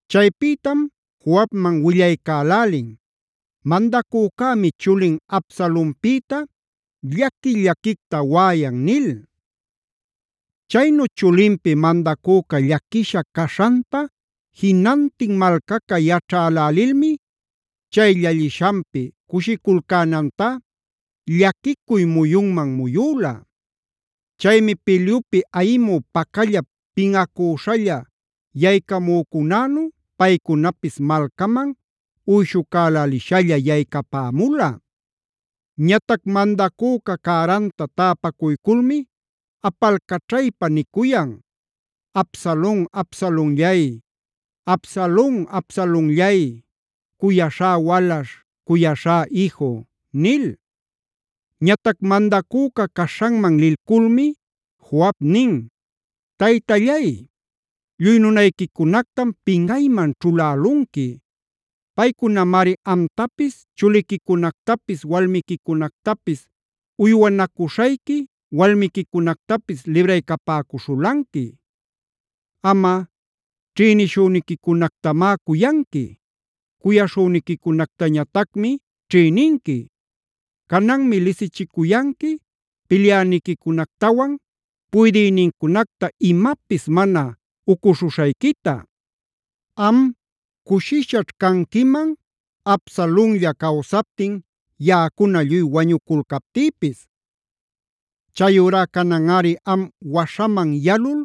Chaypïtam Joabman willaycälälin: “Mandacücämi chulin Absalonpïta llaqui-llaquicta waꞌayan” nil. Chaynu chulinpi mandacüca llaquisha caśhanta jinantin malcaca yaćhälälilmi chay llallishanpi cushiculcänantá llaquicuy muyunman muyüla. Chaymi pilyupi ayimü pacallap pinꞌacüśhalla yaycamücunänu paycunapis malcaman uyshucälälishalla yaycapämula. Ñatac mandacüca cäranta täpacuyculmi apalcaćhaypa nicuyan: “¡Absalon, Absalonllay! ¡Absalon, Absalonllay! ¡Cuyaśhá walaśh! ¡Cuyaśhá iju!” nil. Ñatac mandacüca caśhanman lilculmi Joab nin: “Taytallay, lluy nunayquicunactam pinꞌayman ćhulälunqui. Paycunamari amtapis, chuliquicunactapis, walmiquicunactapis, uywanacuśhayqui walmiquicunactapis libraycapäcuśhulanqui. Amꞌa, ćhïniśhüniquicunactamá cuyanqui. Cuyaśhüniquicunactañatacmi ćhïninqui. Cananmi lisichicuyanqui pilyäniquicunactawan puydïnincunacta imapis mana ucuśhuśhayquita. Am, cushishaćh canquiman Absalonlla cawsaptin, yaꞌacuna lluy wañuculcaptïpis. Chayurá cananꞌari am waśhaman yalul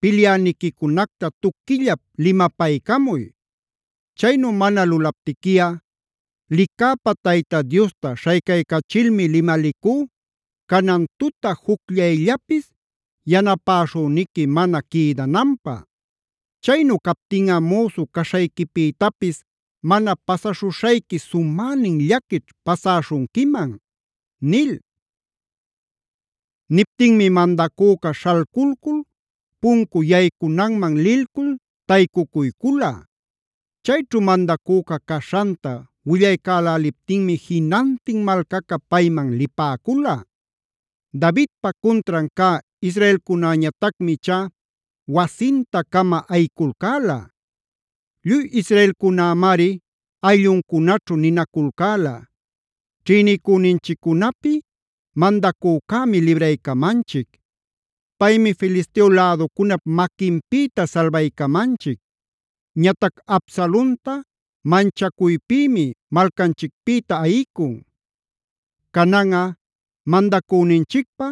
pilyäniquicunacta tuquillap limapaycamuy. Chaynu mana lulaptiquiꞌa licäpä Tayta Diosta śhaycaycachilmi limalicú canan tuta jucllayllapis yanapäśhüniqui mana quïdananpä. Chaynu captinꞌa müsu caśhayquipïtapis mana pasaśhuśhayqui sumänin llaquićh pasäśhunquiman” nil. Niptinmi mandacüca śhalculcul puncu yaycunanman lilcul taycucuycula. Chayćhu mandacüca caśhanta willaycäläliptinmi jinantin malcaca payman lipäcula. Davidpa cuntran cä israelcunäñatacmi ichá wasinta-cama ayiculcäla. Lluy israelcunämari aylluncunaćhu ninaculcäla: “Ćhïnicüninchiccunapi mandacücämi libraycamanchic. Paymi Filisteo läducunap maquinpïta salbaycamanchic. Ñatac Absalonta manchacuypïmi malcanchicpïta ayicun. Cananꞌa mandacüninchicpä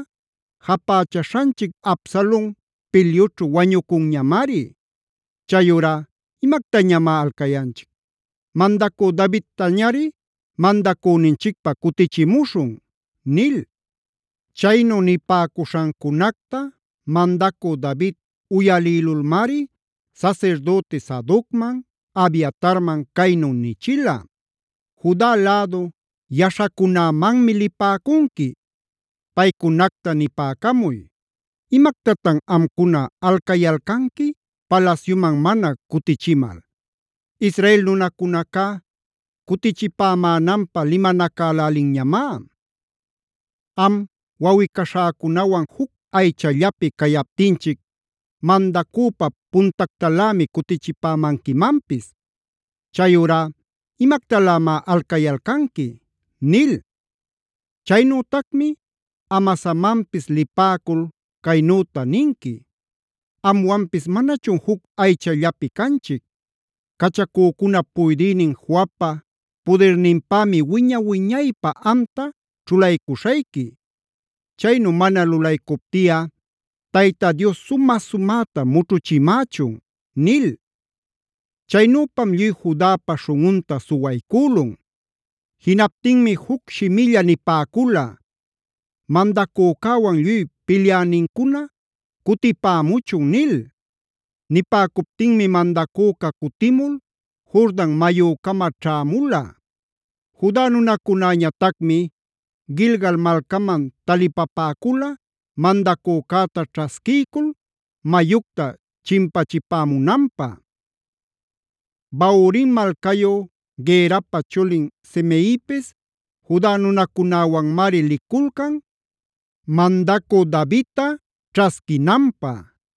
japächaśhanchic Absalon pilyućhu wañucunñamari. Chayurá ¿imactañamá alcayanchic? Mandacü Davidtañari mandacüninchicpä cutichimuśhun” nil. Chaynu nipäcuśhancunacta mandacü David uyalïlulmari sasirdüti Sadocman, Abiatarman caynu nichila: “Juda lädu yaśhacunämanmi lipäcunqui. Paycunacta nipäcamuy: ‘¿Imactatan amcuna alcayalcanqui palasyuman mana cutichimal? Israel nunacunacá cutichipämänanpä limanacälälinñamá. Am wawꞌi-caśhäcunawan juc aychallapi cayaptinchic, mandacüpa puntactalämi cutichipämanquimanpis. Chayurá ¿imactalämá alcayalcanqui?’ nil. Chaynütacmi Amasamanpis lipäcul caynüta ninqui: ‘¿Amwanpis manachun juc aychallapi canchic? Cachacücunap puydïnin Joabpa pudirninpämi wiña-wiñaypä amta chulaycuśhayqui. Chaynu mana lulaycuptiꞌa Tayta Dios sumä-sumäta mućhuchimächun’” nil. Chaynüpam lluy Judapa śhunꞌunta suwaycülun. Jinaptinmi juc shimilla nipäcula: “Mandacücäwan lluy pilyänincuna cutipämuchun” nil. Nipäcuptinmi mandacüca cutimul Jordan mayücama ćhämula. Juda nunacunäñatacmi Gilgal malcaman talipapäcula mandacücäta ćhasquiycul mayucta chimpachipämunanpä. Bahurim malcayu Gerapa chulin Simeipisa Juda nunacunäwanmari liculcan mandacü Davidta ćhasquinanpä.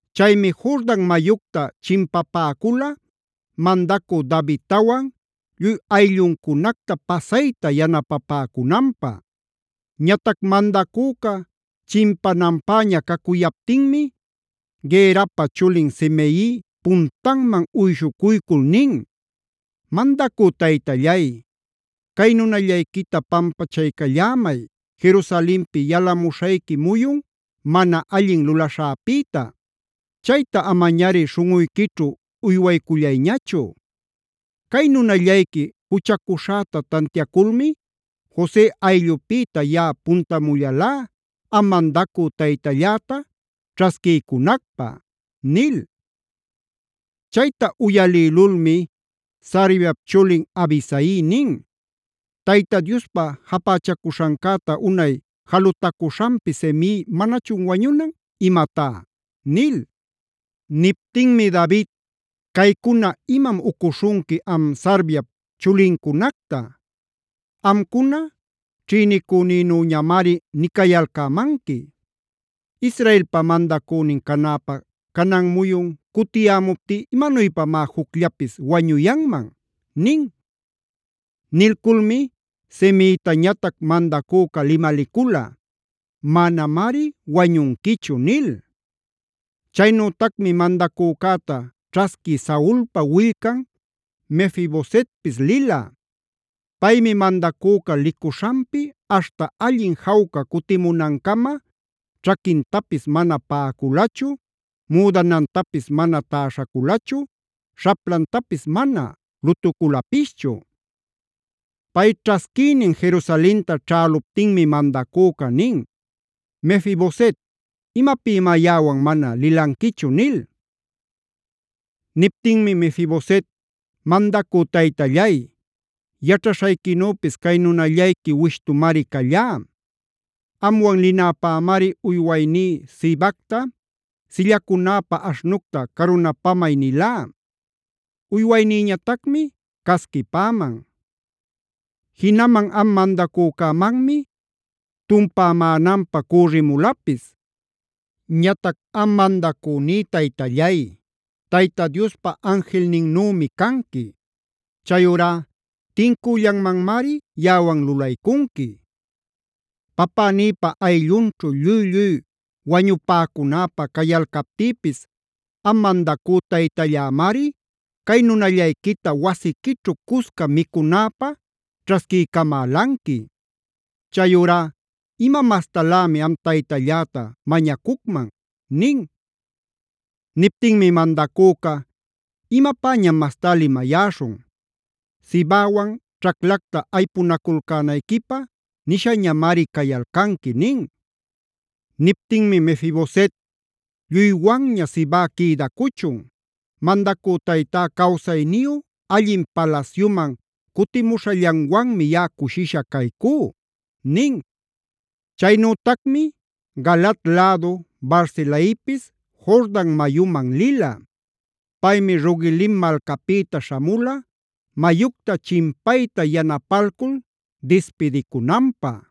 Chaymi Jordan mayucta chimpapäcula mandacü Davidtawan lluy aylluncunacta pasayta yanapapäcunanpä. Ñatac mandacüca chimpananpäña cacuyaptinmi Gerapa chulin Simei puntanman uyshucuycul nin: “Mandacü taytallay, cay nunallayquita pampachaycallämay Jerusalenpi yalamuśhayqui muyun mana allin lulaśhäpïta. Chayta amañari śhunꞌuyquićhu uywaycullayñachu. Cay nunallayqui juchacuśhäta tantiaculmi Jose ayllupïta yaꞌa puntamullalá am mandacü taytalläta ćhasquiycunacpä” nil. Chayta uyalïlulmi Sarviap chulin Abisai nin: “¿Tayta Diospa japächacuśhancäta unay jalutacuśhanpi Simei manachun wañunan imamá?” nil. Niptinmi David: “Caycuna imam ucuśhunqui am Sarviap chulincunacta. Amcuna ćhïnicünïnüñamari nicayalcämanqui. ¿Israelpa mandacünin canäpä canan muyun cutiyämuptí imanuypamá jucllapis wañuyanman?” nin. Nilculmi Simeitañatac mandacüca limalicula: “¡Manamari wañunquichu!” nil. Chaynütacmi mandacücäta ćhasqui Saulpa willcan Mefi-bosetpis lila.b Paymi mandacüca licuśhanpi aśhta allin jawca cutimunancama ćhaquintapis mana paꞌaculachu, müdanantapis mana täśhaculachu, śhaplantapis mana lutuculapischu. Pay ćhasquïnin Jerusalenta ćhäluptinmi mandacüca nin: “Mefi-boset, ¿imapïmá yaꞌawan mana lilanquichu?” nil. Niptinmi Mefi-boset: “Mandacü taytallay, yaćhaśhayquinüpis cay nunallayqui wishtumari callá. Amwan linäpämari uywayní Sibacta: ‘Sillacunäpä aśhnucta carunapamay’ nilá. Uywaynïñatacmi casquipäman. Jinaman am mandacücämanmi tumpämänanpä cürrimulapis. Ñatac am mandacüní taytallay, Tayta Diospa anjilninnümi canqui. Chayurá tincüllanmanmari yaꞌawan lulaycunqui. Papänïpa ayllunćhu lluy-lluy wañupäcunäpä cayalcaptïpis am mandacü taytallämari cay nunallayquita wasiquićhu cusca micunäpä ćhasquiycamälanqui. Chayurá ¿ima mastalämi am taytalläta mañacucman?” nin. Niptinmi mandacüca: “¿Imapäñam mastá limayäśhun? Sibawan ćhaclacta aypunaculcänayquipä nishañamari cayalcanqui” nin. Niptinmi Mefi-boset: “Lluywanña Siba quïdacuchun. Mandacü taytá cawsayniyu allin palasyuman cutimuśhallanwanmi yaꞌa cushisha caycú” nin. Chaynütacmi Galaad lädu Barzilaipisc Jordan mayuman lila. Paymi Rogelim malcapïta śhamula mayucta chimpayta yanapalcul dispidicunanpä.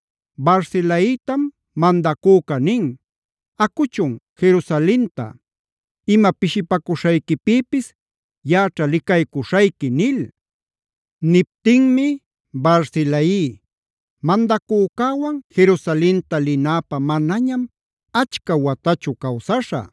Barzilaitam mandacüca nin: “Acuchun Jerusalenta. Ima pishipacuśhayquipïpis yaꞌaćha licaycuśhayqui” nil. Niptinmi Barzilai: “Mandacücäwan Jerusalenta linäpä manañam achca watachu cawsaśhä.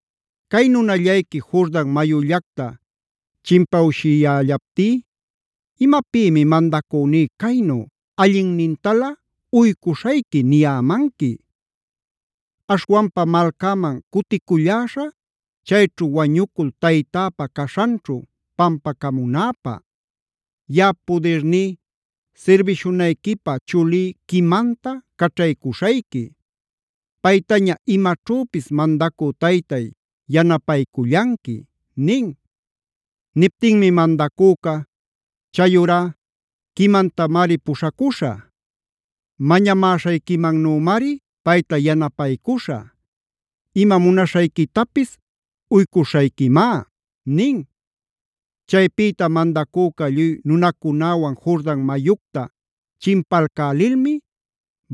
Cay nunallayqui Jordan mayullacta chimpawshiyällaptí ¿imapïmi mandacüní caynu ‘allinnintalä uycuśhayqui’ niyämanqui? Aśhwanpa malcäman cuticulläśhä, chayćhu wañucul taytäpa caśhanćhu pampacamunäpä. Yaꞌap pudirní sirbishunayquipä chulí Quimamta caćhaycuśhayqui. Paytaña imaćhüpis mandacü taytay, yanapaycullanqui” nin. Niptinmi mandacüca: “Chayurá Quimamtamari puśhacuśhä. Mañamäśhayquimannümari payta yanapaycuśhä; ima munaśhayquitapis uycuśhayquimá” nin. Chaypïta mandacüca lluy nunacunäwan Jordan mayucta chimpalcälilmi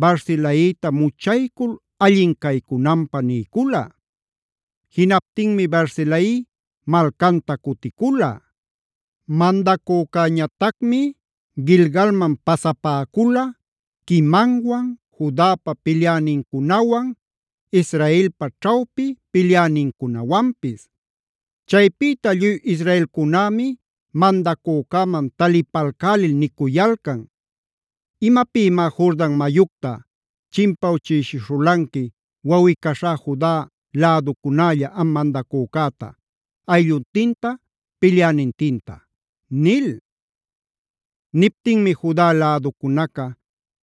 Barzilaita muchaycul allin caycunanpä niycula. Jinaptinmi Barzilai malcanta cuticula. Mandacücäñatacmi Gilgalman pasapäcula Quimamwan, Judapa pilyänincunawan, Israelpa ćhawpi pilyänincunawanpis. Chaypïta lluy israelcunämi mandacücäman talipalcälil nicuyalcan: “¿¡Imapïmá Jordan mayucta chimpawchïshishulanqui wawꞌi-caśhá Juda läducunälla am mandacücäta, aylluntinta, pilyänintinta!?” nil. Niptinmi Juda läducunaca: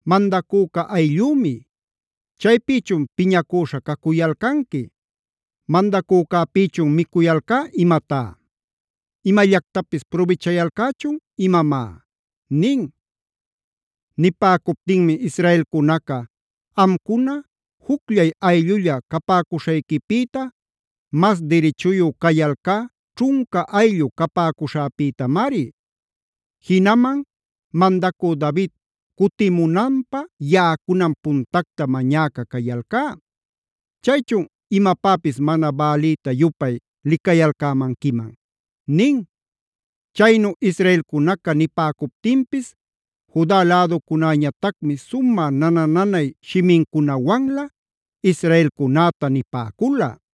“Mandacüca ayllümi. ¿Chaypïchun piñacüśha cacuyalcanqui? ¿¡Mandacücäpïchun micuyalcá imatá!? ¿¡Imallactapis prubichayalcächun imamá!?” nin. Nipäcuptinmi israelcunaca: “Amcuna jucllay ayllulla capäcuśhayquipïta mas dirichuyu cayalcá ćhunca ayllu capäcuśhäpïtamari. Jinaman mandacü David cutimunanpä yaꞌacunam puntacta mañäca cayalcá. ¿Chaychun imapäpis mana bälïta-yupay licayalcämanquiman?” nin. Chaynu israelcunaca nipäcuptinpis Juda läducunäñatacmi sumä nana-nanay shimincunawanlä israelcunäta nipäcula.